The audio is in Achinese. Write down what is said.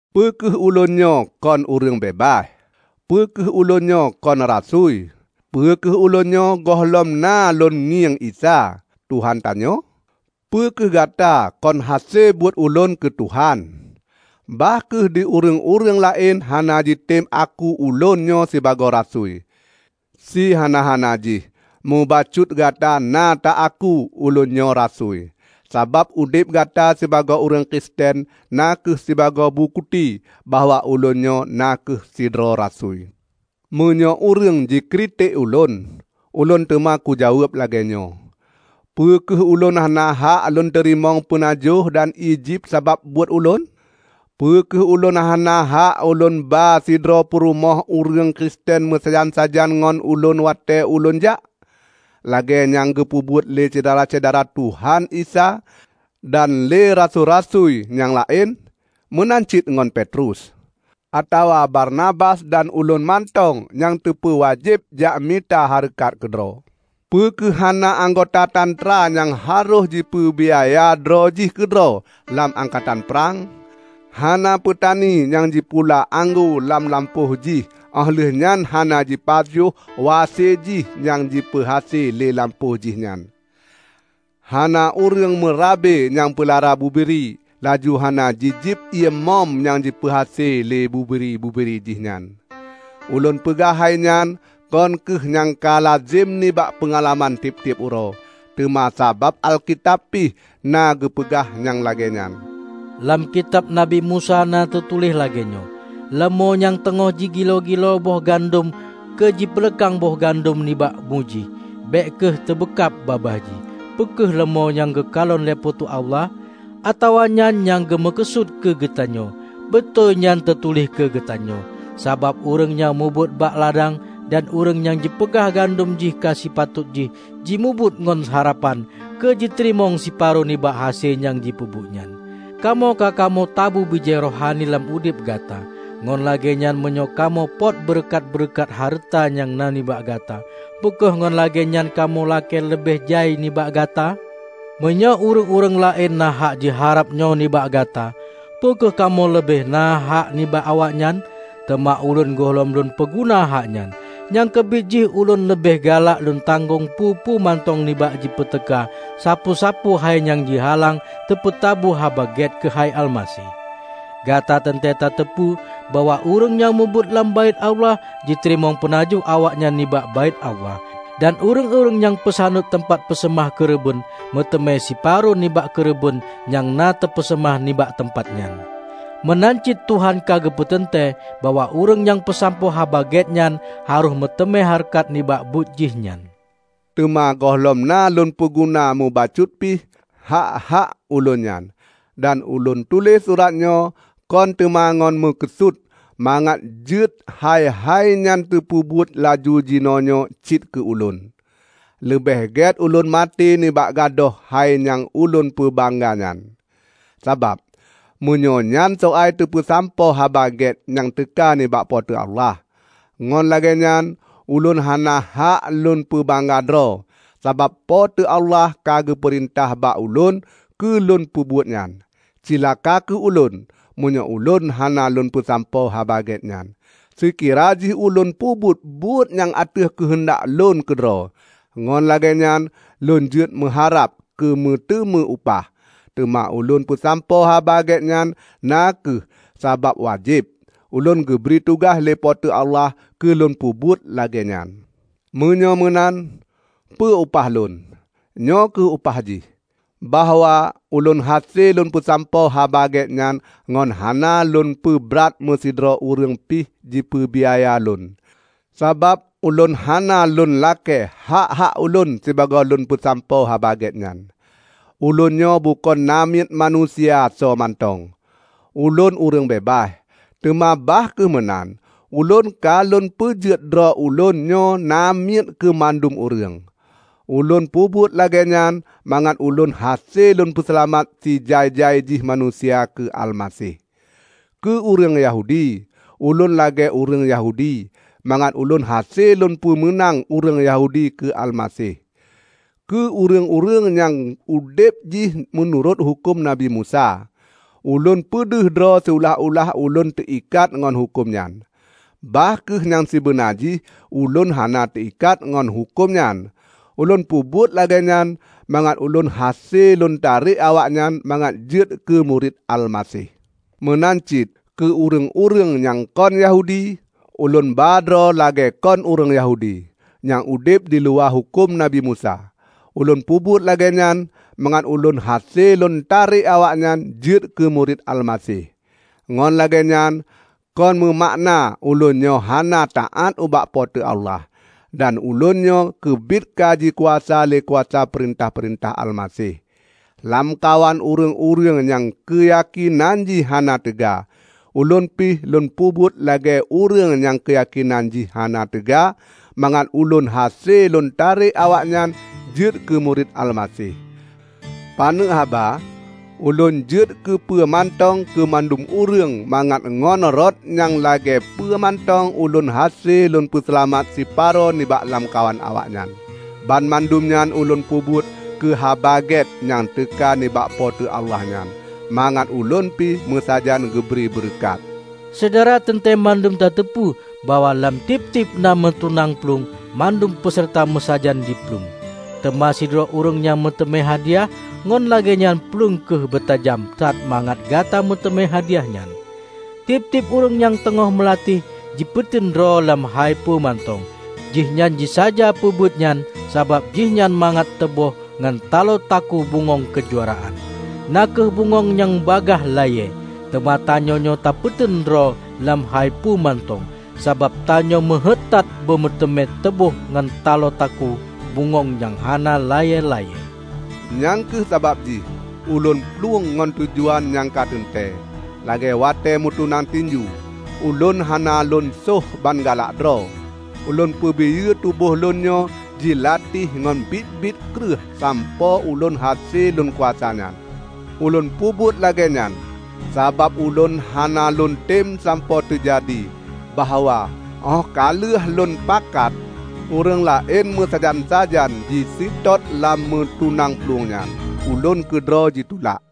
Peu kheueh ulôn nyoe kon ureuëng beubaih? Peu kheueh ulôn nyoe kon rasui? Peu kheueh ulôn nyoe gohlom na lôn ngieng Isa, Tuhan tanyoe? Peu kheueh gata kon hase buet ulôn keu Tuhan? Bah kheueh di ureuëng-ureuëng laén hana jitem aku ulôn nyoe sibagoe rasui, sihana-hana jih mubacut gata na ta aku ulôn nyoe rasui! Sabab udeb gata sibagoe ureuëng Kristen na kheueh sibagoe bukeuti bahwa ulôn nyoe na kheueh sidroe rasui. Meunyoe ureuëng jikritek ulôn, ulôn teuma kujaweueb lagée nyoe: Peu kheueh ulôn hana hak lôn teurimong peunajoh dan ié jieb sabab buet ulôn? Peu kheueh ulôn hana hak ulôn ba sidroe purumoh ureuëng Kristen meusajan-sajan ngon ulôn watée ulôn jak, lagée nyang geupeubuet lé syedara-syedara Tuhan Isa dan lé rasui-rasui nyang laén, meunan cit ngon Petrus? Atawa Barnabas dan ulôn mantong nyang teupeuwajéb jak mita hareukat keudroe? Peu kheueh hana anggota tantra nyang harôh jipeubiaya droe jih keudroe lam angkatan prang! Hana peutani nyang jipula anggô lam lampôh jih óh lheueh nyan hana jipajoh wase jih nyang jipeuhase lé lampôh jih nyan! Hana ureuëng meurabe nyang peulara bubiri, laju hana jijieb ié mom nyang jipeuhase lé bubiri-bubiri jih nyan! Ulôn peugah hai nyan kon kheueh nyang ka lazem nibak peungalaman tieb-tieb uroe, teuma sabab Alkitab pih na geupeugah nyang lagée nyan. Lam Kitab Nabi Musa na teutuléh lagée nyoe, "Leumô nyang teungoh jigiloe-giloe boh gandom keu jipeuleukang boh gandom nibak mu jih, bék kheueh teubeukab babah jih." Peu kheueh leumô nyang geukalon lé Po teu Allah? Atawa nyan nyang geumeukeusut keu geutanyoe? Beutôi nyan teutuléh keu geutanyoe. Sabab ureuëng nyang mubuet bak ladang dan ureuëng nyang jipeugleh gandom jih ka sipatot jih jimubuet ngon harapan keu jiteurimong siparo nibak hase nyang jipeubuet nyan. Kamoe ka kamoe tabu bijéh rohani lam udeb gata. Ngon lagée nyan meunyoe kamoe pot beureukat-beureukat hareuta nyang na nibak gata, peu kheueh ngon lagée nyan kamoe lakée leubeh jai nibak gata? Meunyoe ureuëng-ureuëng laén na hak jiharab nyoe nibak gata, peu kheueh kamoe leubeh na hak nibak awaknyan? Teuma ulôn gohlom lôn peuguna hak nyan. Nyang keubiet jih ulôn leubeh galak lôn tanggong peue-peue mantong nibak jipeuteuka sapeue-sapeue hai nyang jihalang teupeutabu Haba Gét keuhai Almaseh. Gata teuntée tateupeu bahwa ureuëng nyang mubuet lam Baét Allah jiteurimong peunajoh awaknyan nibak Baét Allah. Dan ureuëng-ureuëng nyang peusaneut teumpat peuseumah keureubeuen, meuteumé siparo nibak keureubeuen nyang na teupeuseumah nibak teumpat nyan. Meunan cit Tuhan ka geupeuteuntée bahwa ureuëng nyang peusampoe Haba Gét nyan harôh meuteumé hareukat nibak buet jih nyan. Teuma gohlom na lôn peuguna mubacut pih nibak hak-hak ulôn nyan. Dan ulôn tuléh suratnyoe kon teuma ngon meukeusut mangat jeuet hai-hai nyan teupeubuet laju jinoenyoe cit keu ulôn. Leubeh gét ulôn maté nibak gadôh hai nyang ulôn peubangga nyan. Sabab, meunyoe nyan soai teupeusampoe Haba Gét nyang teuka nibak Po teu Allah, ngon lagée nyan ulôn hana hak lôn peubangga droe, sabab Po teu Allah ka geupeurintah bak ulôn keu lôn peubuet nyan. Cilaka kheueh ulôn, meunyoe ulôn hana lôn peusampoe Haba Gét nyan! Seukira jih ulôn peubuet buet nyan ateueh keuheundak lôn keudroe, ngon lagée nyan lôn jeuet meuharab keu meuteumé upah. Teuma ulôn peusampoe Haba Gét nyan na kheueh sabab wajéb. Ulôn geubri tugaih lé Po teu Allah keu lôn peubuet lagée nyan. Meunyoe meunan, peue upah lôn? Nyoe kheueh upah jih: bahwa ulôn hase lôn peusampoe Haba Gét nyan ngon hana lôn peubrat meusidroe ureuëng pih jipeubiaya lôn, sabab ulôn hana lôn lakée hak-hak ulôn sibagoe lôn peusampoe Haba Gét nyan. Ulôn nyoe bukon namiet manusia soe mantong; ulôn ureuëng beubaih. Teuma bah kheueh meunan, ulôn ka lôn peujeuet droe ulôn nyoe namiet keu mandum ureuëng. Ulôn peubuet lagée nyan mangat ulôn hase lôn peuseulamat sijai-jai jih manusia keu Almaseh. Keu ureuëng Yahudi, ulôn lagée ureuëng Yahudi mangat ulôn hase lôn peumeunang ureuëng Yahudi keu Almaseh. Keu ureuëng-ureuëng nyang udeb jih meunurot huköm Nabi Musa, ulôn peudeh droe siulah-ulah ulôn teuikat ngon huköm nyan, bah kheueh nyang sibeuna jih ulôn hana teuikat ngon huköm nyan. Ulôn peubuet lagée nyan mangat ulôn hase lôn tarek awaknyan mangat jeuet keu murit Almaseh. Meunan cit keu ureuëng-ureuëng nyang kon Yahudi, ulôn ba droe lagée kon ureuëng Yahudi, nyang udeb diluwa huköm Nabi Musa. Ulôn peubuet lagée nyan mangat ulôn hase lôn tarek awaknyan jeuet keu murit Almaseh. Ngon lagée nyan kon meumakna ulôn nyoe hana taát ubak Po teu Allah, dan ulôn nyoe keubiet ka jikuasa lé kuasa peurintah-peurintah Almaseh. Lamkawan ureuëng-ureuëng nyang keuyakénan jih hana teuga, ulôn pih lôn peubuet lagée ureuëng nyang keuyakénan jih hana teuga mangat ulôn hase lôn tarek awaknyan jeuet keu murit Almaseh. Paneuk haba, ulôn jeuet keu peue mantong keu mandum ureuëng mangat ngon rot nyang lagée peue mantong ulôn hase lôn peuseulamat siparo nibak lamkawan awaknyan. Banmandum nyan ulôn peubuet keu Haba Gét nyang teuka nibak Po teu Allah nyan, mangat ulôn pi meusajan geubri beureukat. Syedara teuntée mandum tateupeue bahwa lam tieb-tieb na meutunang plueng mandum peuseurta meusajan jiplueng, teuma sidroe ureuëng nyang meuteumé hadiah. Ngon lagée nyan plueng kheueh beutajam that mangat Gata meuteumé hadiah nyan. Tieb-tieb ureuëng nyang teungoh meulatih, jipeuteun droe lam hai peue mantong. Jihnyan jisaja peubuetnyan sabab jihnyan mangat teuboh ngon taloe takue bungöng keujuaraan, na kheueh bungöng nyang bagaih layée. Teuma tanyoenyoe tapeuteun droe lam hai peue mantong sabab tanyoe meuheuét that beumeuteumé teuboh ngon taloe takue bungöng nyang hana layée-layée. Nyang kheueh sabab jih ulôn plueng ngon tujuan nyang ka teuntée. Lagée watée meutunang tinju, ulôn hana lôn söh ban galak droe. Ulôn peubiyeu tuboh lôn nyoe jilatih ngon biet-biet kreueh sampoe ulôn hase lôn kuasa nyan. Ulôn peubuet lagée nyan, sabab ulôn hana lôntem sampoe teujadi bahwa óh ka lheueh lôn pakat ureuëng laén meusajan-sajan jiseutôt lam meutunang plueng nyan, ulôn keudroe jitulak.